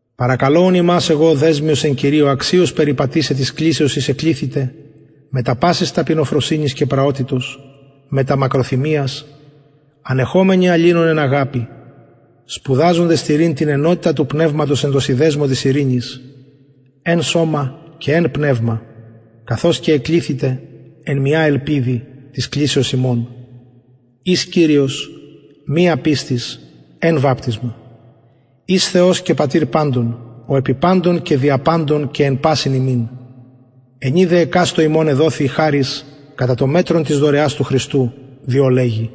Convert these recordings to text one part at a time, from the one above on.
παρακαλω ουν υμας εγω ο δεσμιος εν κυριω αξιως περιπατησαι της κλησεως ης εκληθητε μετα πασης ταπεινοφροσυνης και πραοτητος μετα μακροθυμιας ανεχομενοι αλληλων εν αγαπη σπουδαζοντες τηρειν την ενοτητα του πνευματος εν τω συνδεσμω της ειρηνης εν σωμα και εν πνευμα καθως και εκληθητε εν μια ελπιδι της κλησεως υμων εις κυριος μια πιστις εν βαπτισμα εις θεος και πατηρ παντων ο επι παντων και δια παντων και εν πασιν ημιν ενι δε εκαστω ημων εδοθη η χαρις κατα το μετρον της δωρεας του χριστου διο λεγει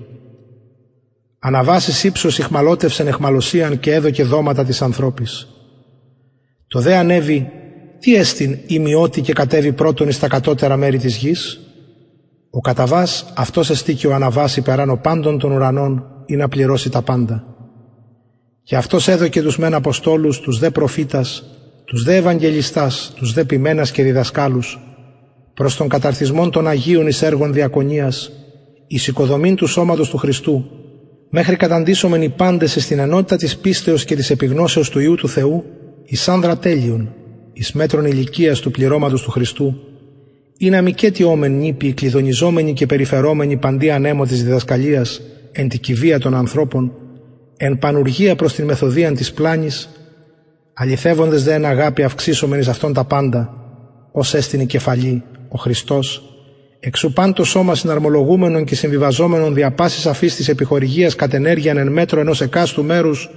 αναβας εις υψος ηχμαλωτευσεν αιχμαλωσιαν και εδωκεν δοματα τοις ανθρωποις το δε ανεβη τι εστιν ει μη οτι και κατεβη πρωτον εις τα κατωτερα μερη της γης ο καταβας αυτος εστιν και ο αναβας υπερανω παντων των ουρανων ινα πληρωση τα παντα και αυτος εδωκεν τους μεν αποστολους τους δε προφητας τους δε ευαγγελιστας τους δε ποιμενας και διδασκαλους προς τον καταρτισμον των αγιων εις εργον διακονιας εις οικοδομην του σωματος του χριστου μεχρι καταντησωμεν οι παντες εις την ενοτητα της πιστεως και της επιγνωσεως του υιου του θεου εις ανδρα τελειον εις μετρον ηλικιας του πληρωματος του χριστου ινα μηκετι ωμεν νηπιοι κλυδωνιζομενοι και περιφερομενοι παντι ανεμω της διδασκαλιας εν τη κυβεια των ανθρωπων εν πανουργια προς την μεθοδειαν της πλανης αληθευοντες δε εν αγαπη αυξησωμεν εις αυτον τα παντα ος εστιν η κεφαλη ο χριστος εξ ου παν το σωμα συναρμολογουμενον και συμβιβαζομενον δια πασης αφης της επιχορηγιας κατ ενεργειαν εν μετρω ενος εκαστου μερους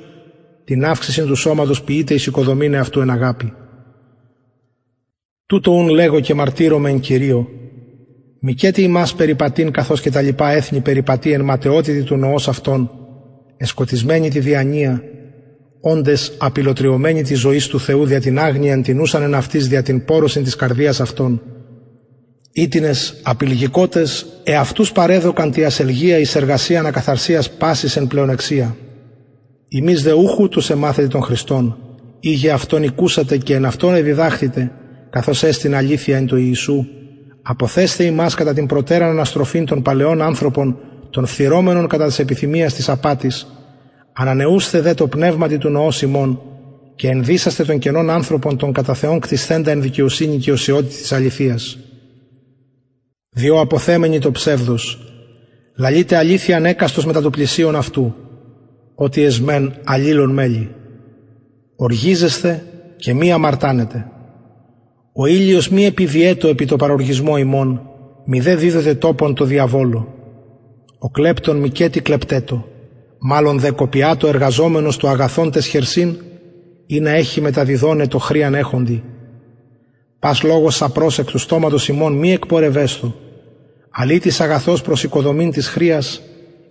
την αυξησιν του σωματος ποιειται εις οικοδομην εαυτου εν αγαπη τουτο ουν λεγω και μαρτυρομαι εν κυριω μηκετι υμας περιπατειν καθως και τα λοιπα εθνη περιπατει εν ματαιοτητι του νοος αυτων εσκοτισμενοι τη διανοια οντες απηλλοτριωμενοι της ζωης του θεου δια την αγνοιαν την ουσαν εν αυτοις δια την πωρωσιν της καρδιας αυτων οιτινες απηλγηκοτες εαυτους παρεδωκαν τη ασελγεια εις εργασιαν ακαθαρσιας πασης εν πλεονεξια υμεις δε ουχ ουτως εμαθετε τον χριστον ειγε αυτον ηκουσατε και εν αυτω εδιδαχθητε καθως εστιν αληθεια εν τω ιησου αποθεσθαι υμας κατα την προτεραν αναστροφην τον παλαιον ανθρωπον τον φθειρομενον κατα τας επιθυμιας της απατης ανανεουσθαι δε τω πνευματι του νοος υμων και ενδυσασθαι τον καινον ανθρωπον τον κατα θεον κτισθεντα εν δικαιοσυνη και οσιοτητι της αληθειας διο αποθεμενοι το ψευδος λαλειτε αληθειαν εκαστος μετα του πλησιον αυτου οτι εσμεν αλληλων μελη οργιζεσθε και μη αμαρτανετε ο ηλιος μη επιδυετω επι τω παροργισμω υμων μηδε διδοτε τοπον τω διαβολω ο κλεπτων μηκετι κλεπτετω μαλλον δε κοπιατω εργαζομενος το αγαθον ταις χερσιν ινα εχη μεταδιδοναι τω χρειαν εχοντι πας λογος σαπρος εκ του στοματος υμων μη εκπορευεσθω αλλ ει τις αγαθος προς οικοδομην της χρειας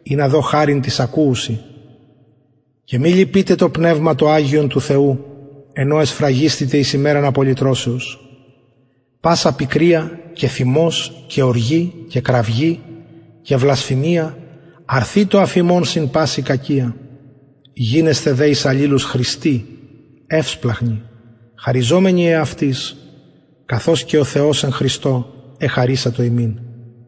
ινα δω χαριν τοις ακουουσιν και μη λυπειτε το πνευμα το αγιον του θεου εν ω εσφραγισθητε εις ημεραν απολυτρωσεως πασα πικρια και θυμος και οργη και κραυγη και βλασφημια αρθητω αφ υμων συν παση κακια γινεσθε δε εις αλληλους χρηστοι ευσπλαγχνοι χαριζομενοι εαυτοις καθως και ο θεος εν χριστω εχαρισατο ημιν